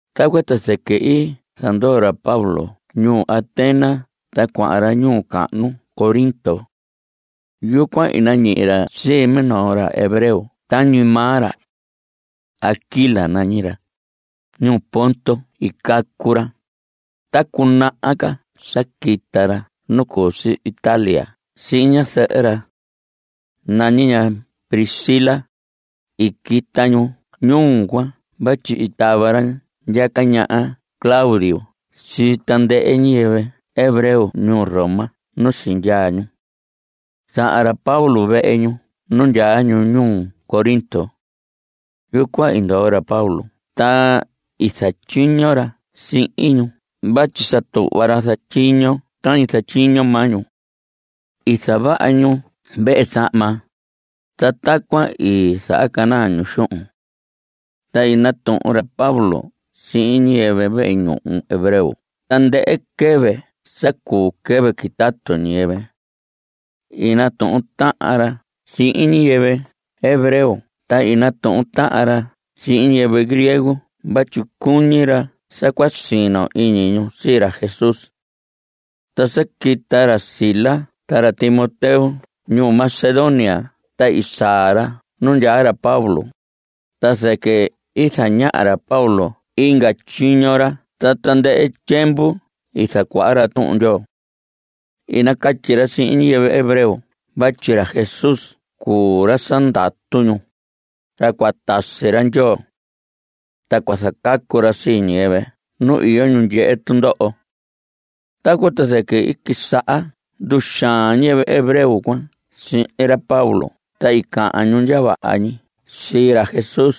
Tacuan ta zɨquɨ i zandoo ra Pablo ñuu Atenas ta cuahan ra ñuu cahnu Corinto. Yucuan i nañihi ra sii minoo ra hebreo tañi maa ra. Aquila nañi ra. Ñuu Ponto i cacu ra. Ta cunaha ca sa quita ra nu cu si Italia sihin ñazɨhɨ ra. Nañi ña Priscila. I quita ñu ñuu cuan vatyi i tava ra ndyaca ñaha Claudio sii tandɨhɨ ñiyɨvɨ hebreo ñuu Roma nu sindyaa ñu. Sahan ra Pablo vehe ñu nu ndyaa ñu ñuu Corinto. Yucuan i ndoo ra Pablo ta i zatyiño ra sihin ñu vatyi sa tuhva ra zatyiño tañi zatyiño maa ñu. I zavaha ñu vehe zahma. Ta tacuan i zahacanaa ñu xuhun. Ta i natuhun ra Pablo sihin ñiyɨvɨ vehe ñuhu hebreo tandɨhɨ quɨvɨ sa cu quɨvɨ quitatu ñiyɨvɨ. I natuhun tahan ra sihin ñiyɨvɨ hebreo ta i natuhun tahan ra sihin ñiyɨvɨ griego vatyi cuñi ra sa cua sino iñi ñu sii ra Jesús. Ta sa quita ra Silas ta ra Timoteo ñuu Macedonia ta i saa ra nu ndyaa ra Pablo, ta zɨquɨ i zaña ra Pablo inga tyiño ra ta tandɨhɨ tyiemvu i zacuaha ra Tuhun Ndyoo. I nacatyi ra sihin ñiyɨvɨ hebreo vatyi ra Jesús cuu ra sa ndatu ñu, ra cua tasi ra Ndyoo. Ta cua zacacu ra sii ñiyɨvɨ nu iyo ñu ndyehe tundoho. Tacuan ta zɨquɨ i quisaha nduxaan ñiyɨvɨ hebreo cuan sihin ra Pablo ta i cahan ñu ndya vaha ñi sii ra Jesús.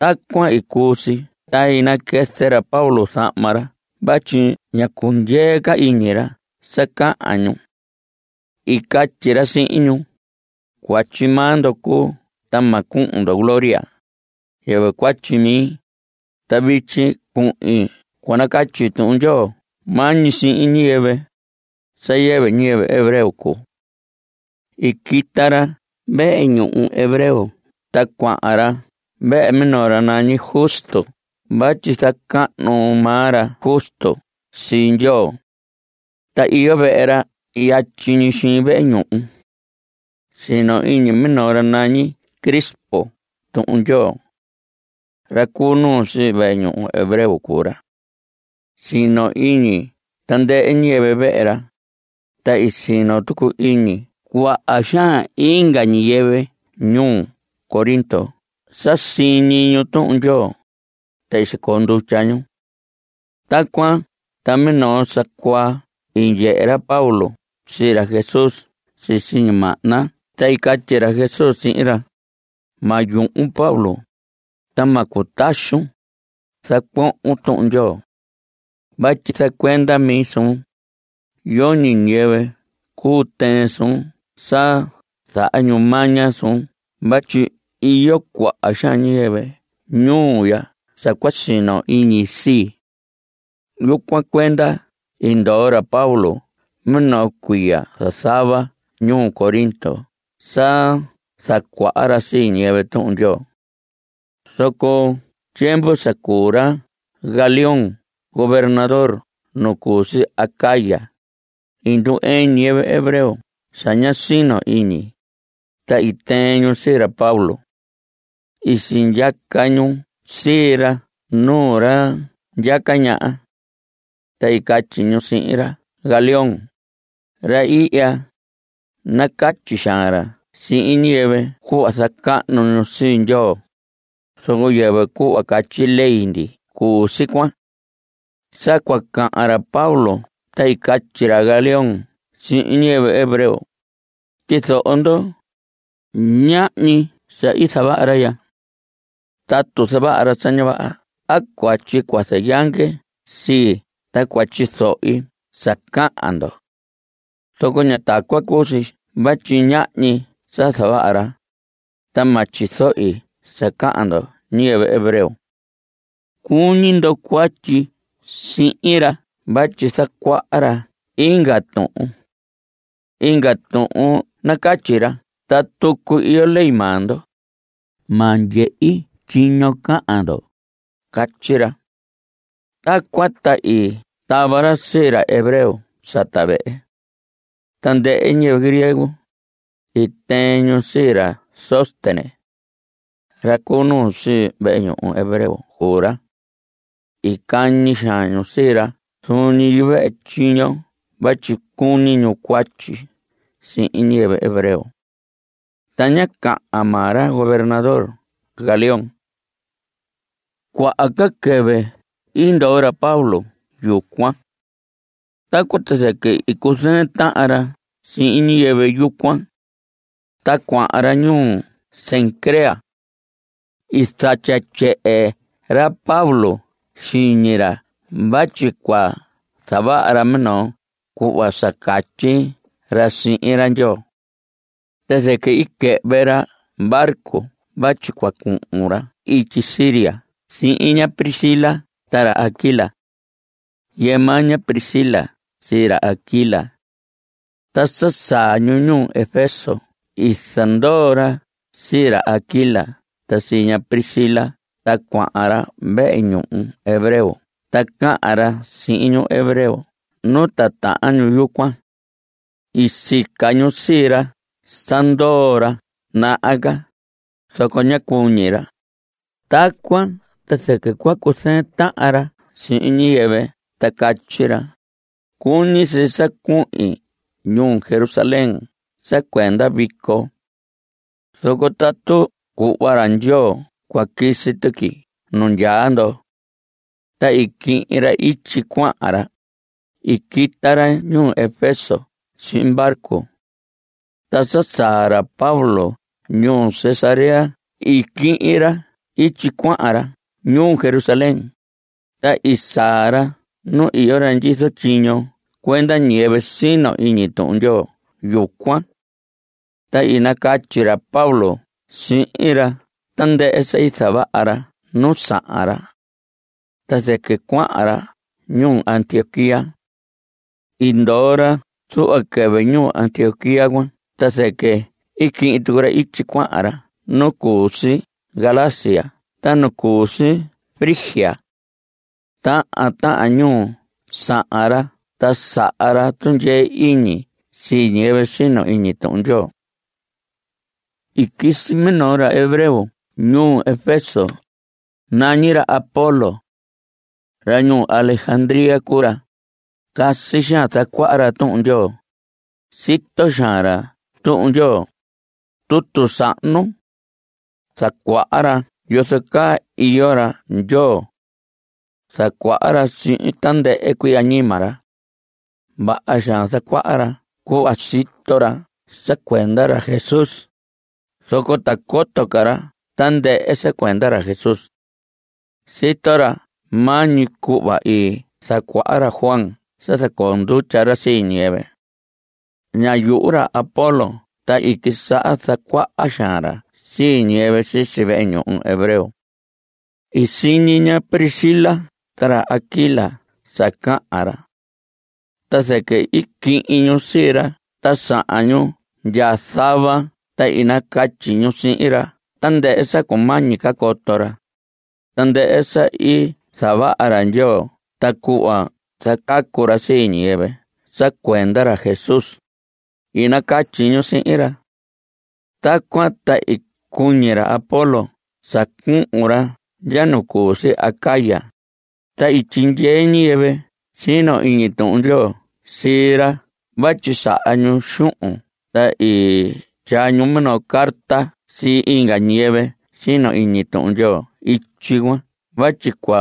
Tacuan i cuu si ta i naquɨzɨ ra Pablo zahma ra vatyi ña cundyee ca iñi ra sa cahan ñu. I catyi ra sihin ñu: Cuatyi maa ndo cuu ta ma cuhun ndo gloria. Yɨvɨ cuatyi mi. Ta vityi cuhin cua nacatyi Tuhun Ndyoo maa ñi sihin ñiyɨvɨ, sa yɨvɨ ñiyɨvɨ hebreo cuu. I quita ra vehe ñuhu hebreo ta cuahan ra vehe minoo ra nañi Justo vatyi zacahnu maa ra Justo sii Ndyoo. Ta iyo vehe ra yatyi ñi xiin vehe ñuhu. Sino iñi minoo ra nañi Crispo Tuhun Ndyoo. Ra cu nuu sii vehe ñuhu hebreo cuu ra. Sino iñi tandɨhɨ ñiyɨvɨ vehe ra. Ta i sino tucu iñi cuaha xaan inga ñiyɨvɨ ñuu Corinto sa siñi ñu Tuhun Ndyoo. Ta i sicoo ndutya ñu. Tacuan ta minoo sa cuaa i ndyehe ra Pablo sii ra Jesús sisi ñimahna ta i catyi ra Jesús sihin ra: Ma yuhun Pablo, ta ma cutaxun. Zacuohon Tuhun Ndyoo. Vatyi zacuenda mi suun. Yoñi ñiyɨvɨ cuu tɨɨn suun sa zaha ñu maña suun vatyi iyo cuaha xaan ñiyɨvɨ ñuu ya sa cua sino iñi sii. Yucuan cuenda i ndoo ra Pablo minoo cuiya zazava ñuu Corinto sa zacuaha ra sii ñiyɨvɨ Tuhun Ndyoo. Zoco tyiemvu sa cuu ra Galión gobernador nu cu si Acaya, i ndu‑ɨɨn ñiyɨvɨ hebreo sa ña sino iñi, ta i tɨɨn ñu sii ra Pablo. I sindyaca ñu sii ra nuu ra ndyaca ñaha. Ta i catyi ñu sihin ra Galión: Ra ihya, nacatyi xaan ra sihin ñiyɨvɨ cuhva zacahnu ñu sii Ndyoo, zoco yɨvɨ cuhva catyi ley ndi cuu si cuan. Sa cua cahan ra Pablo ta i catyi ra Galión sihin ñiyɨvɨ hebreo: Tyizoho ndo. Ñahñi sa i zavaha ra ya. Tatu zavaha ra sa ña vaha a cuatyi cua zayange sii ta cua tyizohi sa cahan ndo. Zoco ña tacuan cuu si vatyi ñahñi sa zavaha ra. Ta ma tyizohi sa cahan ndoho ñiyɨvɨ hebreo. Cuñi ndo cuatyi sihin ra vatyi zacuaha ra inga tuhun. Inga tuhun nacatyi ra ta tucu iyo ley maa ndo. Ma ndyehi tyiño cahan ndo. Catyi ra. Tacuan ta i tava ra sii ra hebreo sata vehe. Tandɨhɨ ñiyɨvɨ griego, i tɨɨn ñu sii ra Sóstenes. Ra cu nuu sii vehe ñuhu hebreo cuu ra. I cañi xaan ñu sii ra zuun ñi yuvehe tyiño vatyi cuñi ñu cuatyi sihin ñiyɨvɨ hebreo. Ta ñá cahan maa ra gobernador Galión. Cuaha ca quɨvɨ i ndoo ra Pablo yucuan. Tacuan ta zɨquɨ i cuzɨɨn tahan ra sihin ñiyɨvɨ yucuan. Ta cuahan ra ñuu Cencrea. I zatya tyehe ra Pablo xiñi ra vatyi cua zavaha ra minoo cuhva sa catyi ra sihin ra Ndyoo. Ta zɨquɨ i quɨhvɨ ra barco vatyi cua cuhun ra ityi Siria sihin ña Priscila ta ra Aquila. Yɨɨ maa ña Priscila sii ra Aquila. Ta sa saa ñu ñuu Efeso i zandoo ra sii ra Aquila ta sii ña Priscila ta cuahan ra vehe ñuhu hebreo ta cahan ra sihin ñu hebreo ñu titahan yucuan. I sica ñu sii ra sa ndoo ra naha ca, zoco ñá cuñi ra. Tacuan ta zɨquɨ cua cuzɨɨn tahan ra sihin ñiyɨvɨ ta catyi ra: Cuñi si sa cuhin ñuu Jerusalén sa cuenda vico. Zoco tatu cuhva ra Ndyoo cua quisi tuqui nu ndyaa ndo. Ta i quihin ra ityi cuahan ra. I quita ra ñuu Efeso sihin barco. Ta sa saa ra Pablo ñuu Cesarea i quihin ra ityi cuahan ra ñuu Jerusalén, ta i saa ra nu iyo ra ndyizo tyiño cuenda ñiyɨvɨ sino iñi Tuhun Ndyoo yucuan. Ta i nacatyi ra Pablo sihin ra tandɨhɨ sa i zavaha ra nu sahan ra. Ta zɨquɨ cuahan ra ñuu Antioquía. I ndoo ra zuhva quɨvɨ ñuu Antioquía cuan ta zɨquɨ i quihin tucu ra ityi cuahan ra nu cu si Galacia ta nu cu si Frigia. Tahan tahan ñuu sahan ra ta saha ra tundyee iñi sii ñiyɨvɨ sino iñi Tuhun Ndyoo. I quisi minoo ra hebreo ñuu Efeso. Nañi ra Apolos. Ra ñuu Alejandría cuu ra. Casi xaan zacuaha ra Tuhun Ndyoo. Sito xaan ra Tuhun Ndyoo, tutu sahnu. Zacuaha ra yozo caa iyo ra Ndyoo. Zacuaha ra sihin tandɨhɨ cuii añima ra. Vaha xaan zacuaha ra cuhva sito ra sa cuenda ra Jesús, zoco ta coto ca ra tandɨhɨ sa cuenda ra Jesús. Sito ra maa ñi cuhva i zacuaha ra Juan sa zacoo ndutya ra sii ñiyɨvɨ. Ñá yuhu ra Apolos ta i quisaha zacuaha xaan ra sii ñiyɨvɨ sisi vehe ñuhu hebreo. I siñi ña Priscila ta ra Aquila sa cahan ra. Ta zɨquɨ i quihin ñu sii ra ta sahan ñu ndya zava ta i nacatyi ñu sihin ra tandɨhɨ sa cumañi ca coto ra, tandɨhɨ sa i zavaha ra Ndyoo ta cuhva zacacu ra sii ñiyɨvɨ sa cuenda ra Jesús, i nacatyi ñu sihin ra. Tacuan ta i cuñi ra Apolos sa cuhun ra ndya nu cu si Acaya, ta i tyindyee ñiyɨvɨ sino iñi Tuhun Ndyoo sii ra vatyi saha ñu xuhun ta i tyaa ñu minoo carta sii inga ñiyɨvɨ sino iñi Tuhun Ndyoo ityi cuan vatyi cua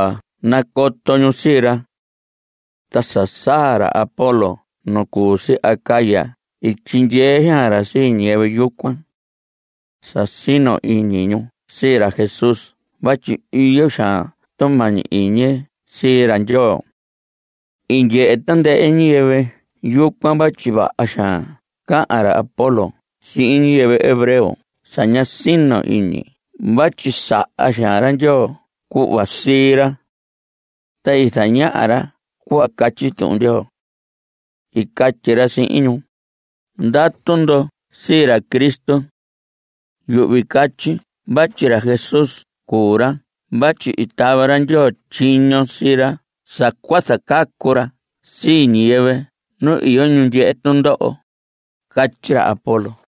nacoto ñu sii ra. Ta sa saa ra Apolos nu cu si Acaya i tyindyee xaan ra sii ñiyɨvɨ yucuan. Sa sino iñi ñu sii ra Jesús vatyi iyo xaan tumañi iñi sii ra Ndyoo. I ndyehe tandɨhɨ ñiyɨvɨ yucuan vatyi vaha xaan cahan ra Apolos sihin ñiyɨvɨ hebreo sa ña sino iñi vatyi saha xaan ra Ndyoo cuhva sii ra. Ta i zañaha ra cuhva catyi Tuhun Ndyoo. I catyi ra sihin ñu: Ndatu ndo sii ra Cristo. Yuhvi catyi vatyi ra Jesús cuu ra vatyi i tava ra Ndyoo tyiño sii ra sa cua zacacu ra sii ñiyɨvɨ nu iyo ñu ndyehe tundoho. Catyi ra Apolos.